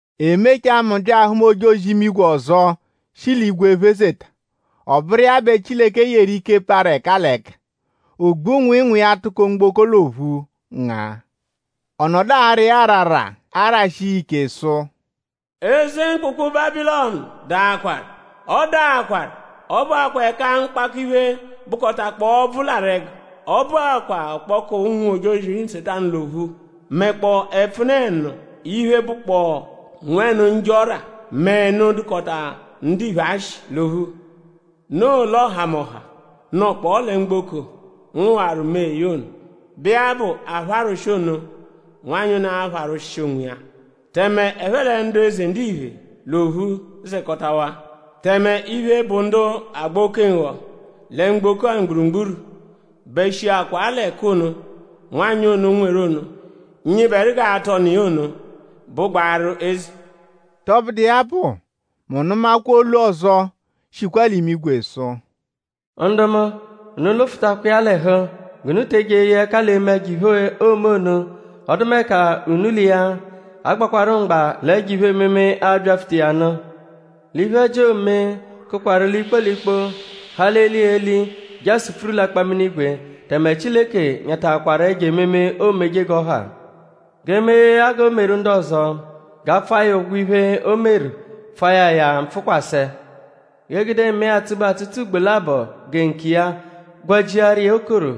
E mechaa; mu bya ahụma ojozi-imigwe ọzo, shi l'igwe phezeta. Ọ bụru iya bẹ Chileke yeru ike parụ ẹka l'ẹka. Ogbu-nwịinwii ya tụko mgboko l'ophu ngaa. Ọ nọdu ara iya arara arashi iya ike sụ: “Eze mkpụkpu Bábilọnu daakwaru! Ọ daakwaru! Ọ bụakwaa ẹka mkpakọ-iphe, bụkotakpoo ọbvu larụ ẹgu. Ọ bụakwaa ọkpoku ụnwu-ojozi Nsetanu l'ophu; mẹkpoo ẹpfune-ẹnu iphe, bụkpoo nwẹnu njọ ọ́rà; mẹ ẹnu, dụkota ndiphe ashị l'ophu. Noo l'ọhamoha, nọkpoo lẹ mgboko ngụwaru mẹe ya ono, bụ iya bụ apharwụshi ono, nwanyị ono apharwụshi onwiya; tẹme ẹphe lẹ ndu eze ndiphe l'ophu zẹkotawaa. Tẹme iphe, bụ ndu agba oke-nghọ lẹ mgboko-a mgburugburu bẹ shiakwa l'ẹku ono, nwanyị ono nweru ono, nyịberu g'aatụ ọnu iya ono bụgbaaru eze.” Tọbudu iya bụ; mu nụmakwa olu ọzo, shikwa l'imigwe sụ: “Ndu mu; unu lụfutakwa iya l'ẹhu; g'unu te eje eye ẹka l'eme ẹjo-iphe, oome ono; ọdumeka unu l'iya a-gbakwarụ mgba l'ẹjo iphe-ememe, a-byapfuta iya nụ; l'iphe-ẹji, oome kụkwaru l'ikpo l'ikpo; ha l'eli l'eli; je asupfuru l'akpaminigwe; tẹme Chileke nyataakwaru ẹjo ememe, oomeje g'ọ ha. G'e mee ya g'o meru ndu ọzo; g'a pfụa ya ụgwo iphe, o meru; pfua ya ya mpfụkwase. G'e gude mẹe atsụ-be atsụtsu ugbo labọ gẹ nkiya gwajiaru iya okoro,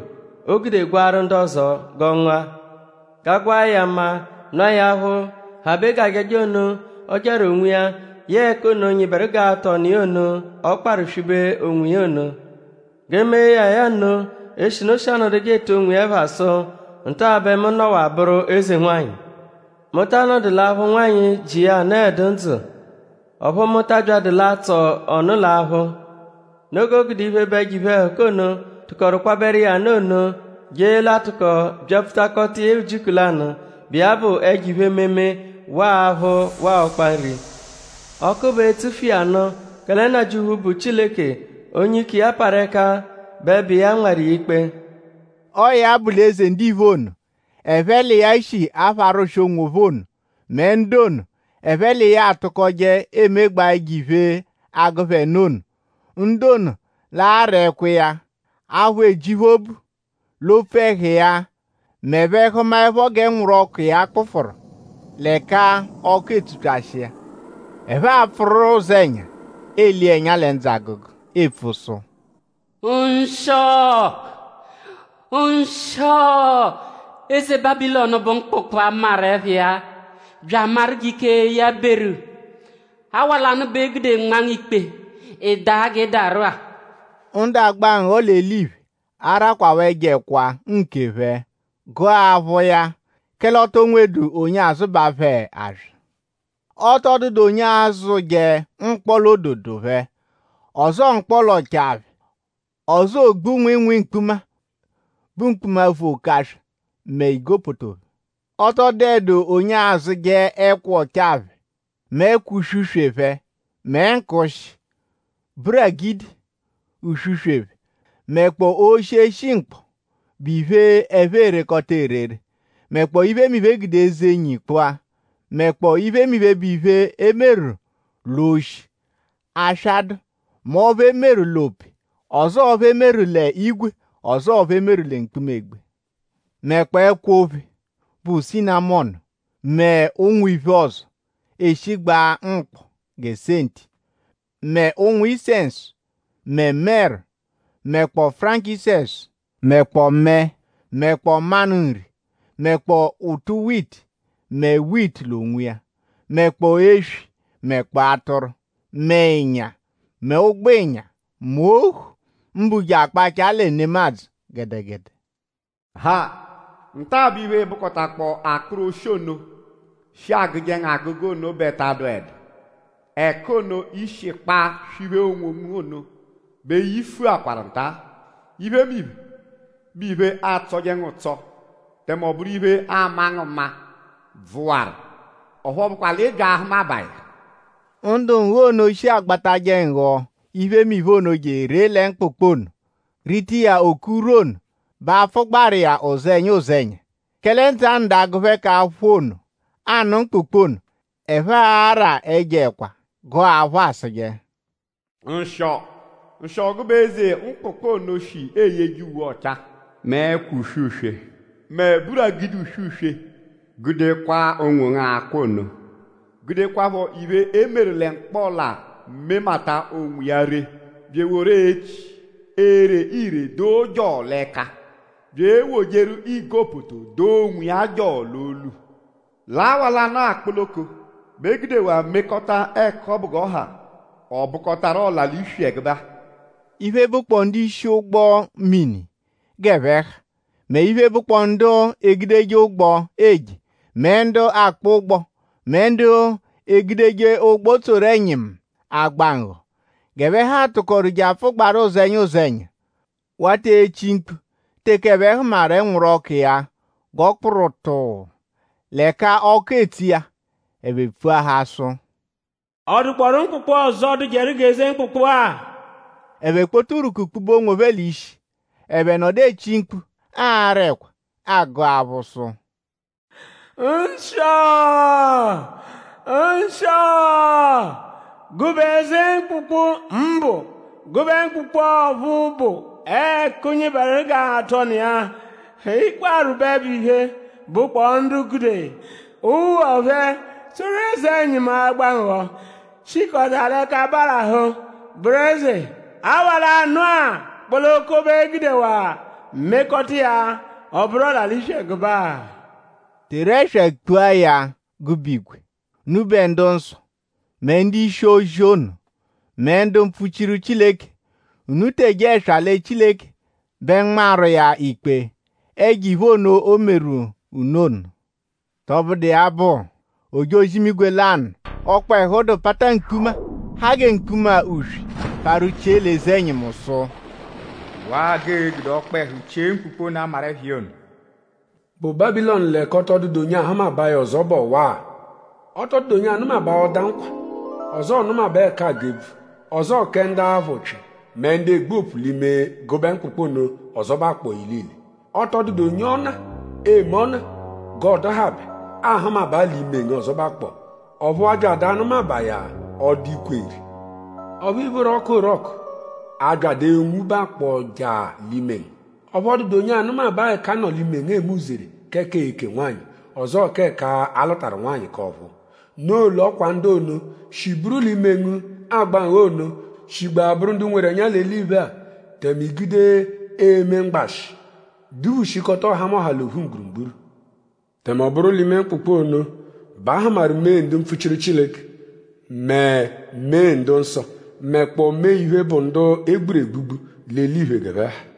o gude gwaaru ndu ọzo g'ọ ngụa. G'a gwaa ya maa; nụa ya aphụ, habe g'ajaja ono, ọ jaru onwiya yẹe ẹku ono, nyịberu g'aatụ ọnu iya ono, ọ kparụ swibe onwiya ono. G'e mee ya ya nno; eshinu o shi anọduje etu onwiya ẹpha sụ: ‘Nta bẹ mu nọwa bụru eze-nwanyị! Mu ta anọdu l'aphụ nwanyị, ji iya anọedu ndzụ. Ọphu mu ta abyadụ l'atsọ ọnu l'aphụ!’ Noo g'o gude iphe, bụ ẹjo iphe-ẹhuka ono, tụkoru kwabẹru iya nụ ono; je l'a-tụko byapfutakọta iya ujiku lanụ, bụ iya bụ ẹjo iphe-ememe; waa aphụ waa ọkpa nri. Ọku bẹ e-tsufu iya nụ; kẹle Nnajịuphu, bụ Chileke; onye ike iya parụ ẹka bẹ bụ iya nmarụ iya ikpe.” Ọo ya bụ l'eze ndiphe ono, ẹphe l'iya shi apharwụshi onwophẹ ono mẹ ndu ono, ẹphe l'iya atụkoje emegbaa ẹjo-iphe, agụ phẹ nụ ono; ndu ono l'a-ra ẹkwa iya; aphụ eji phẹ obu l'opfu ẹhu iya m'ẹphe -hụmaepho g'ẹnwuru-ọku iya kpụfuru; l'ẹka ọku etsupyashi iya. Ẹphe a-pfụru ụzenya ele iya ẹnya lẹ ndzụ agụgu epfu sụ: “Nshịo! Nshịo eze Bábilọnu bụ mkpụkpu, a maru ẹpha iya bya amaru g'ike iya beru; awa lanụ bẹ e gude nma ngu ikpe; ị daa g'ị daru-a!” Ndu agba nghọ l'eliphe arakwaaphọ ẹjo ẹkwa nkephẹ gụa aphụ iya; kẹle o to nweẹdu onye azụbaa phẹ aswa. Ọ tọ dụedu onye azụje mkpọla-ododo phẹ; ọzoo mkpọla-ọchaa phẹ; ọzoo ogbu nwịinwii mkpuma, bụ mkpuma, vu oke aswa mẹ igopoto phẹ. Ọ tọ dụedu onye azụje ẹkwa ọchaa phẹ mẹ ẹkwa uswe-uswe phẹ; mẹ nkụushi; buragidi uswe phẹ; mẹkpoo oshi, eshi mkpọ, bụ iphe, ẹphe erekọta erere; mẹkpoo iphemiphe, e gude eze-nyi kpụa; mẹkpoo iphemiphe, bụ iphe, e meru l'oshi, aswa dụ; mẹ ọphu e meru l'ope; ọzoo ọphu e meru l'ígwè; ọzoo ọphu e meru lẹ mkpuma-egbe; mẹkpoo ẹkwo-ophe, bụ sinamọnu; mẹ ụnwu iphe ọzo, eshigbaa mkpọ gẹ senti; mẹ ụ̀nwù-isẹnsu; mẹ mẹru; mẹkpoo furankisẹnsu; mẹkpoo mẹe; mẹkpoo manụ nri; mẹkpoo ụtu-witi; mẹ witi l'onwiya; mẹkpoo eswi; mẹkpoo atụru; mẹ ịnya; mẹ ụgbo-ịnya; mẹ ohu; mbụ je akpachaa lẹ nemadzụ gẹdegede. “Ha! Nta-a bẹ iphe, bụkotakpoo akpụru oshi ono, shi agụje ngu agụgu ono bẹ ta adụedu. Ẹku ono, i shi kpaa swiphee onwongu ono bẹ yifuakwaru nta; iphemiphe, bụ iphe, atsọje ngu ụtso; tẹme ọ bụru iphe, ama ngu mma bvụwaru; ọphu ọ bụkwa l'ị bya ahụmabaa ya.” Ndu nghọ ono, shi agbatajẹ nghọ iphemiphe ono je eree lẹ mkpụkpu ono rita iya oke urwu ono bẹ a-pfụgbaaru iya ụzenya ụzenya; kẹle ndzụ a-nọdu agụ phẹ k'aphụ ono, aanụ mkpụkpu ono. Ẹphe araa ẹjo-ẹkwa gụa aphụ asụje: “Nshịo! Nshịo gụbe eze mkpụkpu ono shi eyeje uwe ọchaa; mẹ ẹkwa uswe-uswe; mẹ buragidi uswe-uswe gude kwaa onwongu akwa ono! Gudekwaphọ iphe, e meru lẹ mkpọla memata onwiya ree; bya eworu echi, ere ire doo jọo l'ẹka; bya ewojeru igopoto doo onwiya jọo l'olu. L'awa lanụ-a kpoloko bẹ e gudewaa mekọta ẹku ọbu g'ọ ha; ọ bụkotaru ọla-l'iswi ẹgube-a.” Iphe, bụkpoo ndu-ishi ụgbo-mini g'ẹphe ha; mẹ iphe, bụkpoo ndu egudeje ụgbo eje; mẹ ndu akpọ ụgbo; mẹ ndu egudeje ụgbo tsoru eze-ẹnyimu agba nghọ; g'ẹphe ha tụkoru je apfụgbaaru ụzenya ụzenya. Wata echi mkpu teke ẹphe hụmaru ẹnwuru-ọku iya g'ọ kpụru tụuu l'ẹka ọku etsu iya. Ẹphe epfuahaa sụ:?Ọ dụkpoorua mkpụkpu ọzo, dụjeru g'eze mkpụkpu-a? Ẹphe kpota urwuku kpube onwophẹ l'ishi. Ẹphe nọdu echi mkpu ara ẹkwa; agụ aphụ sụ: “Nshịo! Nshịo gụbe eze mkpụkpu, mbụ gụbe mkpụkpu ọphu bụ ẹku, nyịberu g'a-tụ ọnu iya, ị kparụ bẹ iphe, bụkpoo ndu gude ụgbo phẹ tsoru eze-ẹnyimu agba nghọ shikọta l'ẹka barahụ bụru eze!?Awa lanụ-a kpoloko bẹ e gudewaa mekọta iya; ọ bụru ọla-l'iswi ẹgube-a?” Teru ẹswa kpua ya gụbe igwe! Unubẹ ndu-nsọ; mẹ ndu-ishi-ozi ono; mẹ ndu mpfuchiru Chileke unu teje ẹswa lẹ Chileke bẹ nmawaru iya ikpe ẹjo-iphe ono, o meru unu ono! Tọbudu iya bụ; ojozi-imigwe lanụ, ọkpehu dụ; pata mkpuma, ha gẹ mkpuma-uswe parụ chie l'eze-ẹnyimu sụ: “Waa g'ee-gude ọkpehu chie mkpụkpu ono, a maru ẹpha iya ono, bụ Bábilọnu l'ẹka ọ tọ dụdu onye ahụmabaa ya ọzo bụ ọwa-a. Ọ tọ dụdu onye anụmabaa ọda nkwa; ọzoo nụmabaa ẹka a gụ ebvu; ọzoo kẹ ndu aphụ ụpyi mẹ ndu egbu opu l'ime gụbe mkpụkpu ono ọzobakpo ilile. Ọ tọ dụdu onye-ọna, eme ọna g'ọo-dụhabe aahụmabaa l'ime ngu ọzobakpo. Ọphu a byadu anụmabaa ya ọda ikwe-nri. Ọphu ìphóró ọku orọku abyadụ enwubakpọ jaa l'ime ngu; ọphu ọ dụdu onye anụmabaa ẹka a nọ l'ime ngu eme uzere k'ẹka eeke nwanyị; ọzoo k'ẹka a lụtaru nwanyị k'ọ̀phúú. Noo l'ọ kwa ndu ono, shi buru l'ime ngu agba nghọ ono shigbaa bụru ndu nweru ẹnya l'eliphe-a. Tẹme i gude eme mgbashị; duphushikọta ọhamoha l'ophu mgburugburu. “Tẹme ọ bụru l'ime mkpụkpu ono bẹ a hụmaru mee ndu mpfuchiru Chileke mẹ mee ndu-nsọ; mẹkpoo mee iphe, bụ ndu e gburu egbugbu l'eliphe g'ẹphe ha.”